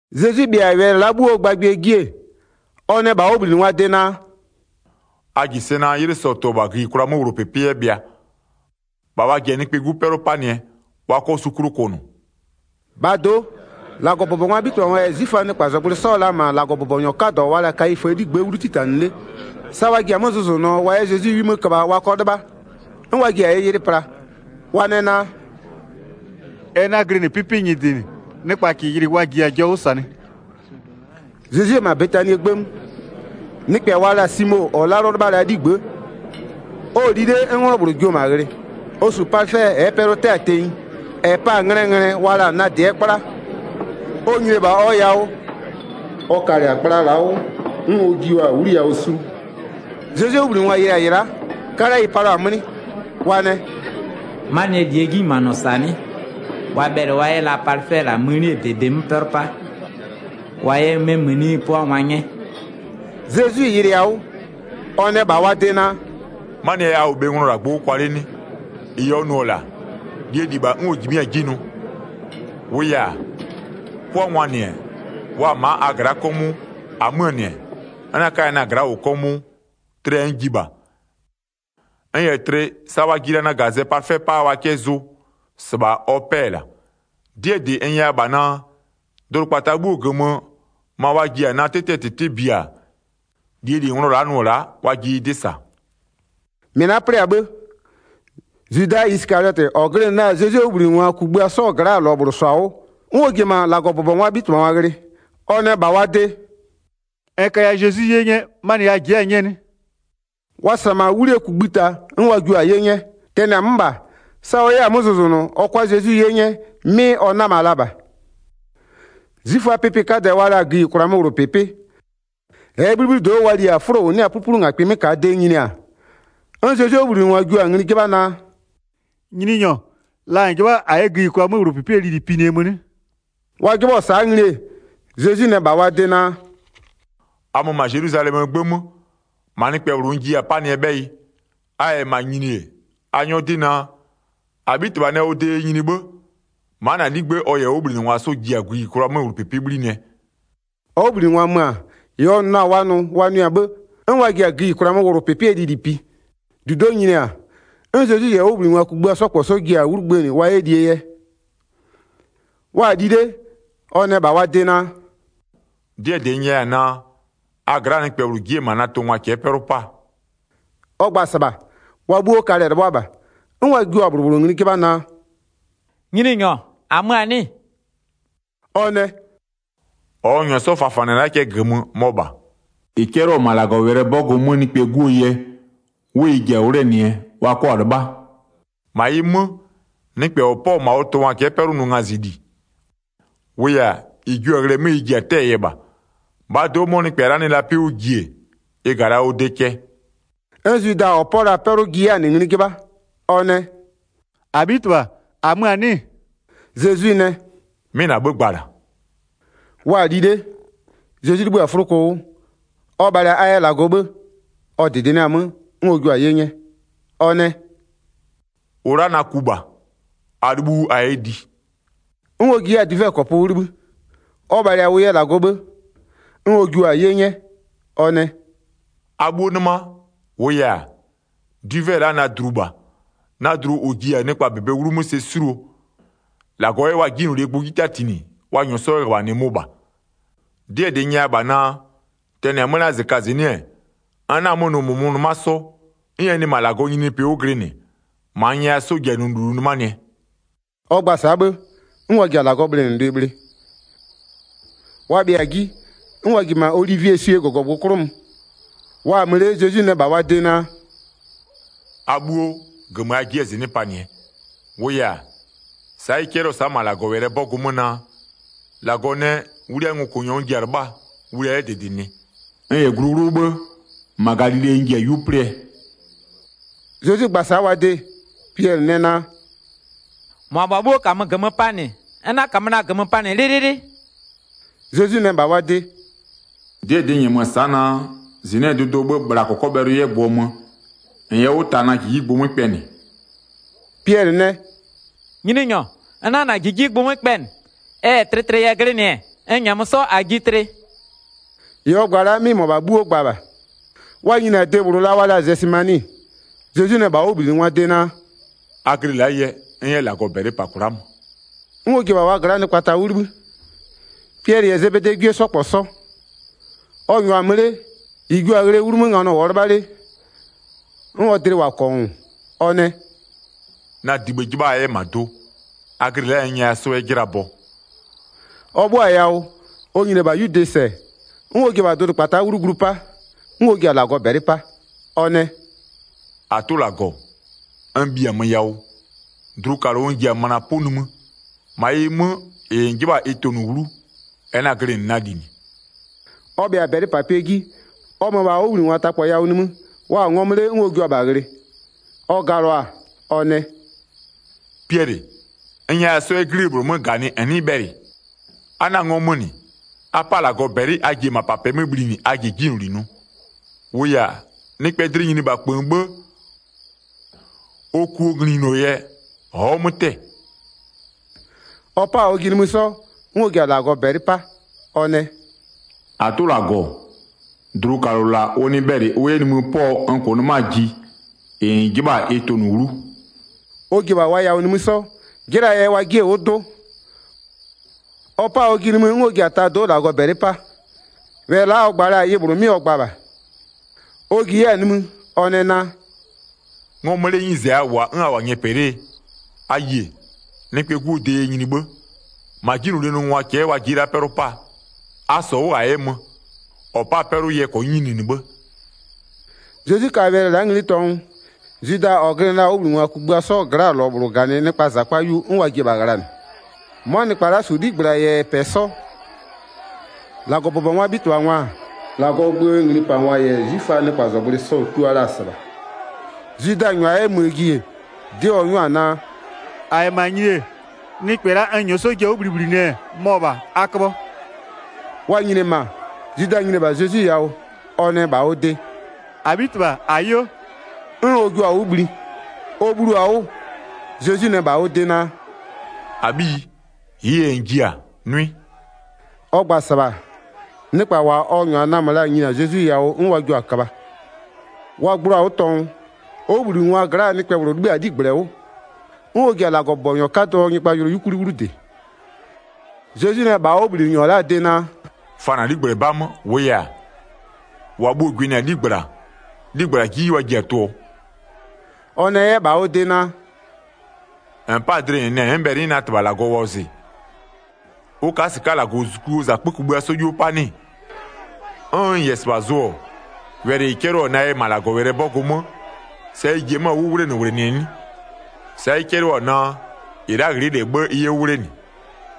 Zezwi bhɩa-a wɛlɩ la'a 'bhuoo gbagbɩɛ ji-e, ɔ nɛ -bha ɔ 'wʋbhlinɩngwaa de naa: “A -ji sɛ naa 'ylɩ sɔ-ɔ tʋ-ɔ -bha gïyikwlaa 'möwlʋpɩpɩ 'yɛ bhɩa, -bha wa ji-a Nɩkpɛɛ 'Gu 'pɛlʋ 'panɩɛ, wa 'kɔ su 'klʋ kʋnʋ.” 3-Bhaa do'o, -Lagɔbʋbɔngwaa 'bhitɩbhangwa -yɛ 'zwiföaa nɩkpazɔgblʋɩ 'sɔ-ɔ la -ma -Lagɔbʋbɔnyɔ 'kadɔ wa la-a Kayiföö 'ligbë'ë 'wlu 'titanɩ 'le. Sa wa ji-a 'mö zʋzʋnʋɔ wa 'yɛ Zezwi 'wi 'mö köbha wa 'kɔ 'lɩbha, 'n wa ji-a ɩ yɩlɩ pla. Wa nɛ naa: “Ɛ 'na-a glɩnɩ 'pɩpɩ nyɩdɩ -nɩ, nɩkpa -kɩɩ yɩlɩ wa -jiya-a jɔ 'wʋ -sanɩ.” Zezwi-e -ma Betanie 'gbë 'mö, nɩkpɛ wa la-a Simo -ɔ 'lalʋ 'lɩbha la-aa 'ligbë'ë, ɔ-ɔ li 'le 'n 'nglɔ -bhlʋ jio-o -ma ghlɩ, ɔ -su palɩfɛ -ɛɛ pɛlʋ-ʋ 'tɛ-a tenyi, -ɛ pa-a nglɛɛ nglɛ wa la-a nadɩɛ 'kpla. Ɔ nyini-e -bha ɔ yawʋ, ɔ kalɩ-a kpla la'a 'wʋ, 'n ɔ jio-a 'wliyawʋ sulu. Zezwie 'wʋbhlinɩngwa yɩlɩ-a -ɩ la'a, 'kalɛ ɩ palʋa-a 'mlɩ. Wa nɛ: “'Manɩɛ -lie 'jinyimanɔ -sa 'nɩ? Wa bhɛlɩ wa 'yɛ la palɩfɛ -la mënie -bebe 'mö 'pɛlʋ 'pa, wa 'yɛ 'mɛ mëni 'pʋangwa 'nyɛ.” Zezwi yɩlɩɩ-a 'wʋ, ɔ nɛ -bha wa de naa: “'Manɩɛ yɛ a -wʋ bhe nglɔ -la gbʋ 'wʋ kwa 'le 'nɩ? -Ɩ ɔ nʋ-ɔ -la, -lie -li -bha 'n ɔ -jimɩ'ɩ-a 'ji nʋ. 11-Wʋʋ yɛ-a, 'pʋangwaa -nɩ-ɛ, wa-a -ma a gla'a 'kɔmʋʋ. -Amöö -nɩ-ɛ, n 'na 'kaya na-a gla'a -wʋ 'kɔmʋʋ. Tlɩɛ n ji -bha. N -yɛ tlɩ, sa wa ji-a na -gazɛ palɩfɛ 'paa wa 'kɛ zʋ, -sɩbha ɔ 'pɛ-ɛ la'a. 'Dɩɛ -dɩ n nyɛya -bha naa: Dʋdʋkpata 'bhuoo -gömö, ma wa ji-a na 'tɩtɩɛ -tɩtɩ biaa, -lie -li nglɔ la'a nʋ-ɔ la'a, wa ji ɩ 'dɩ -sa.” Zwida yɛ Zezwi -ma ɔ tʋngwa cɛ'ɛ 'pɛlʋ 'pa 14-Mɩ la'a 'plɩ-a 'bhë, Zwida Isɩkaliɔtɩ, -ɔ glɩnɩ la-a Zezwie 'wʋbhlinɩngwa kugbïa 'sɔɔ gla'aa -lɔ -bhlʋ -sɔ-a 'wʋ, 'n ɔ ji-e -ma -Lagɔbʋbɔngwaa 'bhitɩbhangwa ghlɩ. Ɔ nɛ -bha wa de: “N kaya Zezwi 'ye 'nyɛ, 'manɩ a ji'i-a 'nyɛɛ 'nɩ?” Wa -sa-a -ma 'wlie kugbïta, 'n wa jio-a 'ye 'nyɛ. Tɛnɩ-a 'mö -bha, sa ɔ 'yɛ-a 'mö zʋzʋnʋ ɔ 'kʋa Zezwi 'ye 'nyɛ 'mɩ ɔ 'nama la -bha. 'Zwiföaa pɩpɩ 'kadɛ wa la-a gïyikwlaa 'möwlʋpɩpɩ -ɛɛ 'bhlibhlido'o wa li-a 'fʋlo -ʋ 'nɩ-a 'pluplungakpɩ 'mö -kaa de nyini-a, 'n Zezwie 'wʋbhlinɩngwa jio-a ngli 'jɩbha naa: “Nyininyɔ, la -n 'jɩbha-a -a 'yɛ gïyikwlaa 'möwlʋpɩpɩɛ lili pinɩɛ mö 'nɩ?” Wa 'jɩbhɔ-ɔ sa'a ngli-e, Zezwi nɛ -bha wa de naa: “A mö -ma Zelwizalɛmöö 'gbë 'mö, -ma nɩkpɛ -bhlʋ n jiya-a 'panɩɛ 'bhɛyɩ. A -yɛ -ma nyini-e, a 'nyɔ 'dɩ naa: -Abhitɩbha nɛ ɔ de yɛ nyini 'bhë, ma'a -na 'ligbë'ë ɔ -yɛ ɔ 'wʋbhlinɩngwa 'sɔ ji-a gïyikwlaa 'möwlʋpɩpɩ 'bhlinɩɛ.” Ɔ 'wʋbhlinɩngwa mö-a, -ɩ ɔ nʋ la-a wa nʋ, wa nʋɩ-a 'bhë, 'n wa ji-a gïyikwlaa 'möwlʋpɩpɩɛ lili pi. 20-Dudo'o nyini-a, 'n Zezwi -yɛ ɔ 'wʋbhlinɩngwa kugbïa 'sɔ -kpɔ 'sɔ ji-a 'wlu gbënɩ wa 'yɛ lie yɛ. Wa-a li 'le, ɔ nɛ -bha wa de naa: “'Dɩɛ -dɩ n nyɛya-a naa, a gla'aa nɩkpɛ -bhlʋ ji'i-e -ma na tʋngwa cɛ'ɛ 'pɛlʋ 'paa.” Ɔ gba-a -sɩbha, wa 'bhuo kalɛ-ɛ 'lɩbhʋa -bha, 'n wa jio-a -bhlʋ -bhlʋ ngli 'jɩbha naa: “Nyininyɔ -amö-a 'nɩ-ɩ?” Ɔ nɛ: “-Ɔ n -nyɔɔ 'sɔ fafanɩ-ɛ la'a cɛ -gömö, mɔ -bha. 24-Ɩ 'cɛlɩɔ-ɔ -ma -Lagɔwɛlɩɛ 'bɔgʋ 'mö Nɩkpɛɛ 'Guo yɛ, 'wʋ ɩ ji-a 'wlenɩɛ, wa 'kɔ-a 'lɩbha. -Ma ɩ 'mö, nɩkpɛ -ɔ 'pɔ-ɔ -ma ɔ tʋngwa cɛ'ɛ 'pɛlʋ nʋ ngazɩli, -wʋʋ yɛ-a, -ɩ jio-a ghlɩɛ 'mö ɩ ji-a 'tɛ-ɛɛ yɛ -bha. -Bhaa do'o 'mɔ nɩkpɛ la'a nɩ la 'pɩ 'wʋ ji-e, ɩ -ga la ɔ de cɛ.” 'N Zwida -ɔ 'pɔɔ la-a 'pɛlʋ ji 'yɛ-a -nɩ ngli 'jɩbha. Ɔ nɛ: “-Abhitɩbha -amö-a 'nɩ-ɩ?” Zezwi nɛ: “'Mɩ -na 'bhë gba-a -la.” Wa-a li 'le, Zezwi 'libhï-a 'fʋloko 'wʋ, ɔ bhalɩ-a a yɛ -Lagɔ 'bhë, ɔ -dɩdɩnɩa-a 'mö, 'n ɔ jua-a 'ye 'nyɛ. Ɔ nɛ: “-Ʋ la'a na ku -bha, a 'libhu 'wʋ a 'yɛ li.” 'N ɔ ji 'yɛ-a dwivɛkɔpʋ 'wʋ 'libhï, ɔ bhalɩ-a ʋ yɛ -Lagɔ 'bhë, 'n ɔ jua-a 'ye 'nyɛ, ɔ nɛ: “A 'bhuo 'nɩma. 28-Wʋʋ yɛ-a, dwivɛ la'a na dlu -bha, na dlu -ʋ ji-a nɩkpa -bebee 'wlumö sɛ 'suluo, -Lagɔ 'yɛ wa 'jinylolie gbʋ 'ji 'tatinɩ, wa -nyʋʋ 'sɔ 'yɛ -ghöbhanɩ mʋ -bha. 'Dɩɛ -dɩ n nyɛya -bha naa: Tɛnɩ-a 'mö la'a -zɩkazɩnɩ'ɩ-ɛ, n 'na-a 'mö nʋ -mʋmʋ 'nɩma 'sɔ, 'n ɛ nɩ -ma -Lagɔɔ nyininyinipɩ 'wʋ glɩnɩ, -ma n nyɛya 'sɔ ji-a nʋ -lulu 'nɩmanɩɛ.” Ɔ gba-a sa'a 'bhë, 'n wa ji-a -Lagɔɔ bhlɩnɩlʋɩ bhlɩ. Wa bhɩa-a 'ji, 'n wa ji-e -ma Olivieswie -gɔgɔgbʋ 'klʋ mö. Wa-a mö 'le Zezwi nɛ -bha wa de naa: “A 'bhuo, -gömö a ji'i-a -zɩnɩ'ɩ panɩɛ, -wʋʋ yɛ-a, sa'a ɩ 'cɛlɩɔ-ɔ sa'a -ma -Lagɔwɛlɩɛ 'bɔgʋ 'mö naa: -Lagɔ nɛ, wliaa ngokʋnyɔ n ji-a 'lɩbhaa, wlia 'yɛ -dɩdɩnɩ. N -yɛ glu 'wlʋ 'bhë, -ma Galile n ji-a 'yu 'plɩɛ.” Zezwi gba-a sa'a wa de, Piɛlɩ nɛ naa: “-Mʋabha 'bhuo -kamö -gömö panɩ-ɛ, n 'na -kamö na-a -gömö panɩ 'lɩlɩlɩ.” Zezwi nɛ -bha ɔ de: “'Dɩɛ -dɩ n -nyɛmö-ö sa'a naa, -zɩnɩ'ɩɛ dʋdʋɔ 'bhë, bhla -kɔkɔbhɛlʋ 'yɛ gbʋɔ mö, -n yɛ 'wʋ ta na -jijigbʋ 'mö kpɛnɩ.” Piɛlɩ nɛ: “Nyininyɔ, n 'na -na -jijigbʋ 'mö kpɛnɩ. Ɛ -yɛ tlɩtlɩ yɛ glɩnɩ-ɛ, n -nyɛmö 'sɔ -a ji tlɩ.” -Ɩ ɔ gba-a la'a 'mɩ -mʋabha 'bhuo gba -bha. Wa nyini-a de -bhlʋ la wa la-a Zɛsɩmani, Zezwi nɛ -bha ɔ 'wʋbhlinɩngwaa de naa: “A glɩ la'a yɛ, n 'yɛ -Lagɔ -bɛlɩ -pa kwla'a mö.” 'N ɔ ji-e -bha wa gla'aa nɩkpa ta 'wʋ 'libhï, Piɛlɩ -yɛ Zebedee 'gwie 'sɔ -kpɔ 'sɔ. Ɔ -nyʋa-a mö 'le, -ɩ jio-a ghlɩɛ 'wlumö nganɔ -wʋɔ 'lɩbha 'le, 'n ɔ dlɩ -wʋ-a -kɔngʋʋ. Ɔ nɛ: “Na dibhë 'jɩbha a 'yɛ -ma do. A glɩ la'a yɛ n nyɛya 'sɔ -a 'yɛ 'jɩla bɔ.” Ɔ 'bhʋa-a yawʋ, ɔ nyini-e -bha 'yude -sɛ, 'n ɔ ji-e -bha dʋdʋkpata'a 'wlu glu 'pa, 'n ɔ ji-a -Lagɔ -bɛlɩ 'pa. Ɔ nɛ: “-Atʋ -Lagɔ, n -bhiamö yawʋ, dlukalʋ n ji-a möna 'pʋ nimï. -Ma ɩ 'mö, -ɩ -n 'jɩbha-a ɩ tʋnʋ 'wlu, ɛ 'na-a glɩnɩ na -li -nɩ.” Ɔ bhɩa-a -bɛlɩpapɩɛ 'ji ɔ mö-ö -bha ɔ 'wʋbhlinɩngwa ta -kpɔ yawʋ nimï, wa-a ngɔmö 'le 'n ɔ jua-a -bha ghlɩ. Ɔ galʋa-a ɔ nɛ: “Piɛlɩ, n nyɛya 'sɔ 'yɛ 'glie -bhlʋ 'mö -ganɩ a 'nɩɩ bhɛlɩ? A 'na-a ngɔmö -nɩ, a 'pa -Lagɔ -bɛlɩ a ji-e -mapapɩɛ 'mö bhlinɩ a ji-e 'jinyloli nʋ. -Wʋʋ yɛ-a, nɩkpɛɛ dlɩ nyini -bha -kpöön 'bhë, ɔ kuo nglinyuno yɛ, ɔ'ɔ 'mö 'tɛ-ɛ.” Ɔ 'pa-a ɔjɩ nimï 'sɔ, 'n ɔ ji-a -Lagɔ -bɛlɩ 'pa, ɔ nɛ: “-Atʋ -Lagɔ, dlukalʋ -la ʋ nɩ bhɛlɩ ʋ 'yɛ nimï 'pɔ-ɔ n -kʋʋ 'nɩmaa ji, -ɩ -n 'jɩbha-a ɩ tʋnʋ 'wlu.” Ɔ ji-e -bha wa yawʋ nimï 'sɔ, 'jɩlaa yɛ wa 'jie-e 'wʋ 'dʋ. Ɔ 'pa-a ɔjɩ nimï 'n ɔ ji-a tado'o -Lagɔ -bɛlɩ 'pa. Wɛlɩ la'a ɔ gba la-a, ɩ -bhlʋ 'mɩ ɔ gba -bha. Ɔ ji 'yɛ-a nimï, ɔ nɛ naa: “Ngɔmö 'lee 'nyize a -wʋ-a 'n a -wʋ-a nyɛpɛ 'lee? A yie! Nɩkpɛɛ 'Guo de yɛ nyini 'bhë. -Ma 'jinylolie nʋngwa cɛ'ɛ wa ji'i-e la'a 'pɛlʋ 'paa. A -sɔ 'wʋ -a 'yɛ mö, -ɔ pa'a-a 'pɛlʋ yɛ -kɔnyɩ nyini 'bhë.” Zezwi ka wɛlɩ la'a ngli tɔngʋ, Zwida -ɔ glɩnɩ la-a ɔ 'wʋbhlinɩngwa kugbïa 'sɔɔ gla'aa -lɔ -bhlʋ -ganɩ nɩkpaa -zakpa 'yu, 'n wa ji-e -bha ghlanɩ. 'Mʋa nɩkpa la'a -su 'ligbla -yɛ -pɛ 'sɔ, -Lagɔbʋbɔngwaa 'bhitɩbhangwa-a, -Lagɔɔ gböö nglipangwa -yɛ 'zwiföaa nɩkpazɔgblʋɩ sɔ-ɔ tua la-a -sɩbha. Zwida -nyʋa 'yɛ möö ji-e, 'dɩ ɔ 'nyʋa-a naa: “-A -yɛ -ma nyini-e, nɩkpɛ la'a n -nyɔɔ ji-a 'wʋ bhlibhlinɩɛ mɔ -bha, a köbhɔ.” Wa nyini-e -ma, Zwida nyini-e -bha Zezwi yawʋ, ɔ nɛ -bha ɔ de: “-Abhitɩbha -ayo” 'n ɔ jio-a 'wʋ bhli. Ɔ bhlio-a 'wʋ, Zezwi nɛ -bha ɔ de naa: “-Abhiyi, -ɩɩ yɛ -n ji-a, nʋɩ.” Ɔ gba-a -sɩbha, nɩkpa -wa ɔ -nyʋa namö la-a nyini-a Zezwi yawʋ 'n wa jio-a köbha. Wa gbloo-a 'wʋ tɔngʋ, ɔ 'wʋbhlinɩngwaa gla'aa nɩkpɛ -bhlʋ 'libhï-a ɔ 'ligblɛ 'wʋ, 'n ɔ ji-a -Lagɔbʋbɔnyɔ 'kadɔɔ nyɩgbajʋlʋ 'yukwli 'wlu -dɩ. Zezwi nɛ -bha ɔ 'wʋbhlinɩnyɔ la'aa de naa: “Fa -na 'ligblɛ 'ba 'mö, -wʋʋ yɛ-a, -wa bhuo-o gwɩnɩ-a 'ligbla, 'ligbla 'ji wa ji-a tʋ-ʋɔ.” Ɔ nɛ 'yɛ -bha ɔ de naa: “-N 'pa-a dlɩ -n nɛ n'n bhɛlɩ n 'yɛ na -Tɩbha -Lagɔ wɔzɩ, ʋ ka'a -sɩka'a -Lagɔzuzukuo -zakpö kugbïa 'sɔ 'yuo 'pa 'nɩ-ɩ? 'N n -yɛ -sɩbha zʋ-ɔ, wɛlɩ -ɩ 'cɛlɩɔ-ɔ na yɛ -ma -Lagɔwɛlɩɛ 'bɔgʋ 'mö sa ɩ ji-e 'mö-a 'wʋ 'wlenɩwlenɩnɩɛ 'nɩ? Sa'a ɩ 'cɛlɩɔ-ɔ naa: -Ɩ la'a ghlɩ'ɩ -lɛ 'bhë ɩ 'yɛ 'wʋ 'wlenɩ.”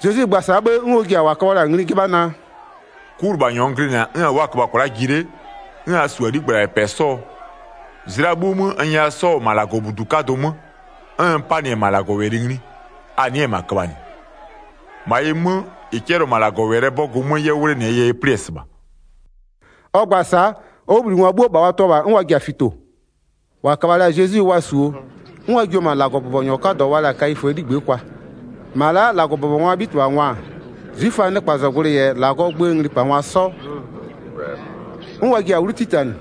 Zezwi gba-a sa'a 'bhë, 'n ɔ ji-a -wa köbhɔ la-a ngli 'jɩbha naa: “'Kulɩbhanyɔ n glɩnɩ-a 'n a wʋ'ʋ-a köbha kwla'a ji 'le, 'n a -su-a 'ligbla -yɛ -pɛ 'sɔɔ? Zlɩa 'bhuo 'mö, n nyɛya 'sɔ-ɔ -ma -Lagɔbudu 'kadʋ 'mö, 'n n 'panɩ-ɛ -ma -Lagɔwɛlɩ ngli, a nɩ'ɩ-ɛ -ma köbhanɩ. 56-Ma ɩ 'mö, -ɩ 'cɛlɩɔ-ɔ -ma -Lagɔwɛlɩɛ 'bɔgʋ 'mö 'yɛ 'wʋ 'wlenɩɛ yɛ ɩ 'plɩ-ɛ -sɩbha.” Ɔ gba-a sa'a, ɔ 'wʋbhlinɩngwa 'bhuo -bha wa tɩɔ -bha 'n wa ji-a fito. Wa yɛ Zezwi -ma 'zwiföaa -zijlitungwa 'kadɩ dlɩ'ɩ kwa 57-Wa köbha la-a Zezwi wa -suo, 'n wa jio-o -ma -Lagɔbʋbɔnyɔ 'kadɔ wa la-a Kayiföö 'ligbë'ë kwa. -Ma la'a -Lagɔbʋbɔngwaa 'bhitɩbhangwa-a, 'zwiföaa nɩkpazɔgblʋɩ -yɛ -Lagɔɔ gböö nglipangwa 'sɔ, 'n wa ji-a 'wlu 'titanɩ.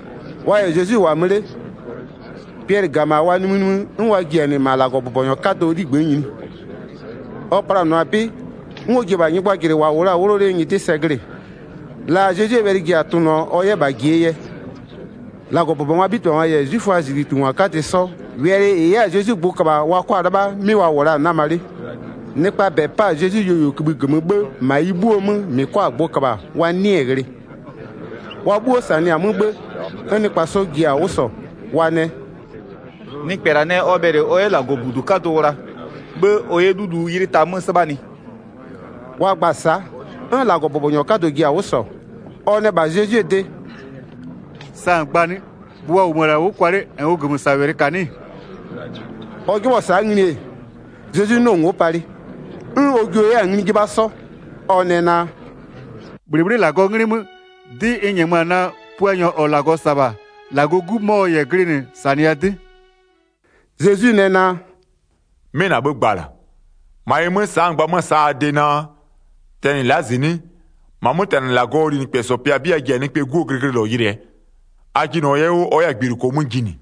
Wa -yɛ Zezwi -wʋ-a mö 'le, Piɛlɩ -ga -ma wa nimïnimï 'n wa ji-a -nɩ -ma -Lagɔbʋbɔnyɔ 'kadɔɔ 'ligbë'ë nyini. Ɔ planʋa-a 'bɩ, 'n ɔ ji-e -bha nyɩgbajʋlʋɩ -wʋ la-a 'wʋlɔ 'lee nyɩdɩ sɛ glɩ-ɩ, la Zezwie wɛlɩ ji-a tʋnʋɔ, ɔ 'yɛ -bha yɩlɩɛ yɛ. 59-Lagɔbʋbɔngwaa 'bhitɩbhangwa -yɛ 'zwiföaa -zijlitungwa 'kadɩ 'sɔ, wɛlɩ -ɩ 'yɛ-a Zezwi gbʋ köbha-a wa 'kɔ-a 'lɩbha, 'mɩ wa -wʋ la-a 'nama 'le. Nɩkpaa -bɛ 'pa-a Zezwi yuoyuokïbhï -gömö 'bhë -ma ɩ 'bhuo 'mö -mɩ 'kɔ-a gbʋ -köbha wa 'nɩɩ-ɩ ghlɩ. Wa 'bhuo -sanɩ-a 'mö 'bhë, 'n nɩkpa 'sɔ ji-a 'wʋ -sɔ. Wa nɛ: “Nɩkpɛ -la nɛ ɔ bhɛlɩ ɔ 'yɛ -Lagɔbudu 'kadʋ wla, 'bhë ɔ 'yɛ 'lulu 'ylɩ ta 'mö 'sɩbhanɩ.” Wa gba-a sa'a, 'n -Lagɔbʋbɔnyɔ 'kadɔ ji-a 'wʋ -sɔ, ɔ nɛ -bha Zezwie de: “Sa -n gba-a 'nɩ? Gbʋ wa -wʋmö-ö -la 'wʋ kwa 'le -nn ʋ -gömösawɛlɩ -ka 'nɩ-ɩ?” Ɔ 'jɩbhɔ-ɔ sa'a ngli-e, Zezwi 'nɩɔ-ɔ ngo'o palɩ. 'N ɔ jio 'yɛ-a ngli 'jɩbha 'sɔ, ɔ nɛ naa: “-Bhlɩbhlɩ'ɩ -Lagɔɔ 'nglɩ 'mö, 'dɩ n -nyɛmö-a naa: Puanyɔ -ɔ -Lagɔ -sa-a -bha, -Lagɔɔ 'Gu mɔ -n -yɛ glɩnɩ -sanɩya 'dɩ.” Zezwi nɛ naa: “'Mɩ -na 'bhë gba-a -la. -Ma ɩ 'mö, sa'a n gba 'mö-ö sa'a a de naa, tɛnɩ la'a -zɩnɩ'ɩ, -ma 'mötɛnɩ -Lagɔɔ linɩkpɛsɔ pɩa 'bɩ a ji-a Nɩkpɛɛ 'Guo glɩglɩlɔ yɩlɩɛ. A jɩnɩɔ 'yɛ 'wʋ ɔ 'yɛ-a gbiluko 'mö jinɩ.”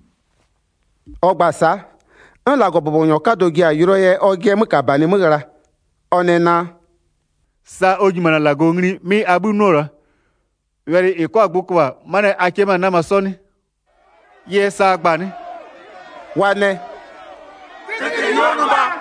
Ɔ gba-a sa'a, 'n -Lagɔbʋbɔnyɔ 'kadɔ ji-a yʋlʋɔ yɛ ɔjɩɛ 'mökabanɩ 'mö ghla. Ɔ nɛ naa: “Sa ɔ nyimanɩ-a -Lagɔ ngli 'mɩ abhï 'nʋ-ɔ -la. Wɛlɩ -ɩ 'kɔ-a gbʋ köbha 'manɩɛ yɛ -a 'kɩ-ɛ 'mö-a 'nama 'sɔ 'nɩ? Ɩ yɛ sa a gba-a 'nɩ?” Wa nɛ: “Tlɩtlɩli ɔ nʋ -bha.”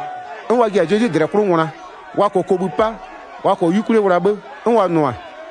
'N wa ji-a Zezwi -dlɛ 'klʋ ngwla. Wa -kɔɔ kobhï 'pa, wa -kɔɔ 'yukwlie wla 'bhë, 'n wa nʋ-a: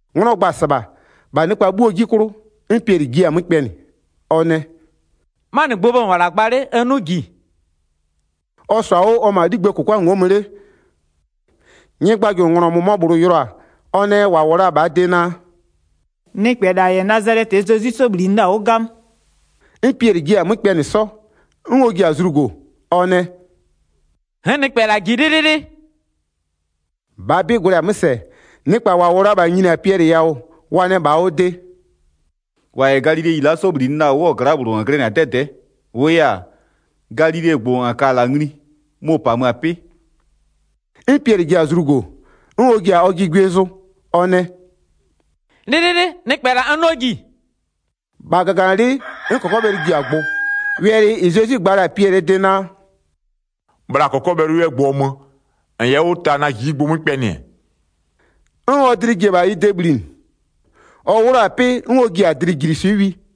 'Nglɔ gba-a -sɩbha, -bha nɩkpa 'bhuoo 'ji 'klʋ, 'n Piɛlɩ jiɩ-a 'mö kpɛnɩ. Ɔ nɛ: “'Manɩ gbʋɔ bhë -n -wʋ-ɔ -la gba 'le n 'nʋ na-a -ji.” Ɔ -sɔ-a 'wʋ ɔ-ɔ -ma 'ligbëë -kʋkwa ngo'o mö 'le, nyɩgbajʋlʋnglɔ -mʋmɔ -bhlʋ yɩlɩɔ-a, ɔ nɛ -wa -wʋ la-a -bhaa de naa: “Nɩkpɛ -la -yɛ Nazalɛtɩɛ Zezwi 'sɔ -bhlinɩ la-a 'wʋ 'gamö.” 'N Piɛlɩ jiɩ-a 'mö kpɛnɩ 'sɔ, 'n ɔ ji-a zlugo, ɔ nɛ: “N'n nɩkpɛ -la -ji 'lɩlɩlɩ.” 73-Bhaa 'bɩ gwlɛ-a 'mö -sɛ-ɛ, nɩkpa -wʋ la-a -bha nyini-a Piɛlɩ yawʋ, wa nɛ -bha ɔ de: “-Wa -yɛ galileyi la'a 'sɔ -bhlinɩ la-a 'wʋɔ gla'aa -bhlʋ -n glɩnɩ-a 'dɛdɛ'ɛ, -wʋʋ yɛ-a, galilegbʋ -n ka-a -la ngli, mʋ-ʋ -pamö-a 'pɩ.” 'N Piɛlɩ ji-a zlugo 'sɔ, 'n ɔ ji-a ɔjɩ gwie zʋ ɔ nɛ: “'Lɩlɩlɩ, nɩkpɛ -la n 'nɩɔ -ji.” -Bha -gaganɩlɩ'ɩ 'n -kɔkɔbhɛlʋ ji-a gbʋ. Wɛlɩ -ɩ Zezwi gba la-a Piɛlɩɛ de naa: “Bhla -kɔkɔbhɛlʋ 'yɛ gbʋɔ mö, -n yɛ 'wʋ ta na -jijigbʋ 'mö kpɛnɩ-ɛ,” 'n ɔ dlɩ ji-e -bha ɩ de bhlinɩ. Ɔ 'wlʋ-a 'pɩ 'n ɔ ji-a dlɩjiliswɩ'ɩ wi.